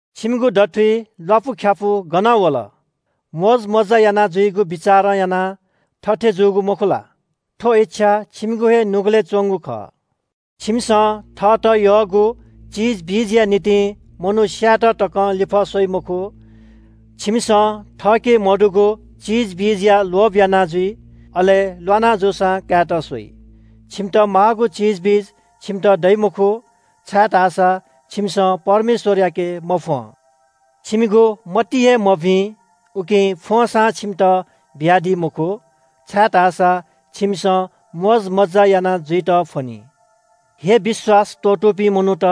छिमिगु दथुइ ल्‍वापुख्‍यापु गनं वल? मोजमज्‍जा यानाजुइगु बिचारं यानाः थथे जूगु मखु ला? थ्‍व इच्‍छा छिमिगु हे नुगलय् च्‍वंगु खः। छिमिसं थःत यःगु चिजबिजया निंतिं मनू स्‍यायेत तकं लिफः स्‍वइ मखु। छिमिसं थःके मदुगु चिजबिजया लोभ याना जुइ, अले ल्‍वाना जूसां कायेत स्‍वइ। छिमित माःगु चिजबिज छिमित दइ मखु, छाय्‌धाःसा छिमिसं परमेश्‍वरयाके मफ्‍वं। छिमिगु मति हे मभिं, उकिं फ्‍वंसां छिमित बियादी मखु, छाय्‌धाःसा छिमिसं मोजमज्‍जा याना जुइत फ्‍वनी। हे विश्‍वास त्‍वःतूपिं मनूत,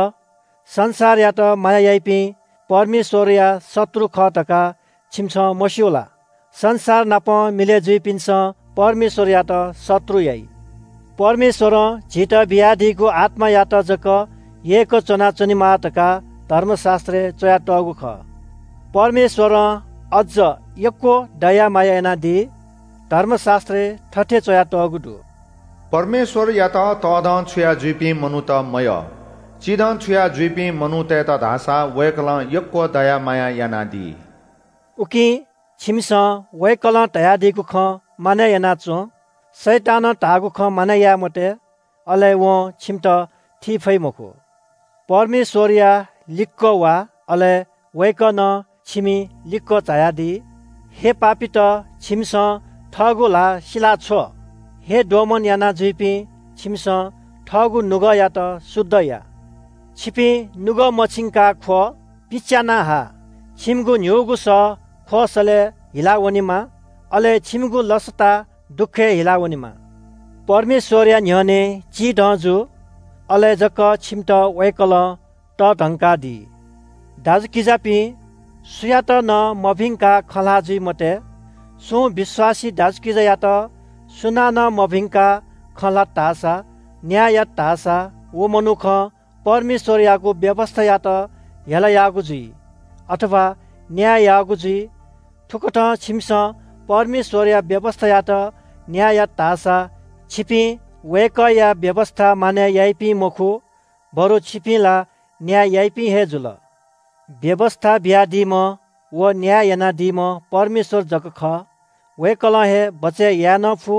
संसारयात माया याइपिं परमेश्‍वरया शत्रु खः धकाः छिमिसं मस्‍यू ला? संसार नाप मिलय् जुइपिन्‍सं परमेश्‍वरयात शत्रु याइ। परमेश्‍वरं झीत बियादीगु आत्‍मायात जक यय्‌क च्‍वनाच्‍वनेमाः धकाः धर्मशास्‍त्रय् च्‍वयातःगु खः। परमेश्‍वरं अज्‍ज यक्‍व दया माया यानादी। धर्मशास्‍त्रय् थथे च्‍वयातःगु दु – “परमेश्‍वरयात तःधंछुया जुइपिं मनूत मयः। चिधंछुया जुइपिं मनूतय्‌त धाःसा वय्‌कलं यक्‍व दया माया यानादी।” उकिं छिमिसं वय्‌कलं धयादीगु खँ मानय् याना च्‍वँ। शैतानं धाःगु खँ मानय् याये मते, अले वं छिमित थी फइ मखु। परमेश्‍वरया लिक्‍क वा, अले वय्‌कः नं छिमि लिक्‍क झायादी। हे पापीत, छिमिसं थःगु ल्‍हाः सिलाछ्व। हे दोमन यानाजुइपिं, छिमिसं थःगु नुगःयात शुद्ध या। छिपिं नुगः मछिंकाः ख्‍व, पिच्‍याना हा। छिमिगु न्‍हिगु सः ख्‍वःसलय् हिलावनेमा, अले छिमिगु लसता दुःखय् हिलावनेमा। परमेश्‍वरया न्‍ह्यःने चिधं जु। अले जक छिमित वय्‌कलं तःधंकादी। दाजुकिजापिं, सुयात नं मभिंकाः खँ ल्‍हाः जुइ मते। सुं विश्‍वासी दाजुकिजायात सुनानं मभिंकाः खँ ल्‍हात धाःसां, न्‍याय यात धाःसां, व मनुखं परमेश्‍वरयागु व्‍यवस्‍थायात हेला याःगु जुइ, अथवा न्‍याय याःगु जुइ। थुकथं छिमिसं परमेश्‍वरया व्‍यवस्‍थायात न्‍याय यात धाःसा छिपिं वय्‌कःया व्‍यवस्‍था मानय् याइपिं मखु बरु छिपिं ला न्‍याय याइपिं हे जुल। व्‍यवस्‍था बियादीम्‍ह व न्‍याय यानादीम्‍ह परमेश्‍वर जक खः। वय्‌कलं हे बचय् याये नं फु,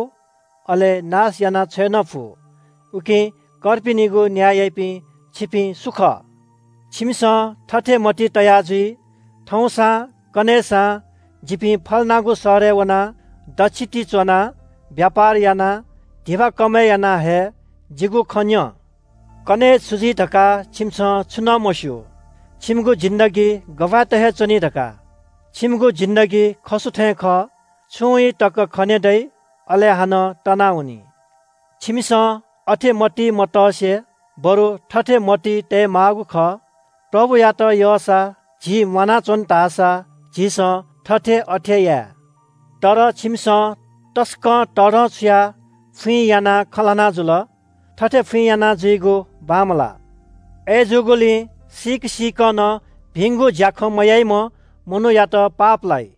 अले नाश यानाछ्वये नं फु। उकिं कर्पिनिगु न्‍याय याइपिं छिपिं सु खः? छिमिसं थथे मतिइ तया जुइ – “थौंसां कन्‍हय्‌सां जिपिं फल्‍नागु शहरय् वनाः दच्‍छि ति च्‍वनाः ब्‍यापार यानाः धिबा कमय् याना हये।” जिगु खँ न्‍यँ– कन्‍हय् छु जुइ धकाः छिमिसं छुं नं मस्‍यू। छिमिगु जीवन छु हे खः धकाः? छिमिगु जिन्‍दगी खसु थें खः। छुं ई तक खने दइ, अले हानं तनावनी। छिमिसं अथे मतिइ मतसे, बरु थथे मतिइ तयेमाःगु खः – “प्रभुयात यःसा, झी म्‍वानाच्‍वन धाःसा झीसं थथे अथे याये।” तर छिमिसं तसकं तःधंछुयाः फुइँ यानाः खँ ल्‍हाना जुल। थथे फुइँ यानाजुइगु बांमलाः। अय्‌जूगुलिं सीक सीकं नं भिंगु ज्‍याखँ मयाइम्‍ह मनूयात पाप लाइ।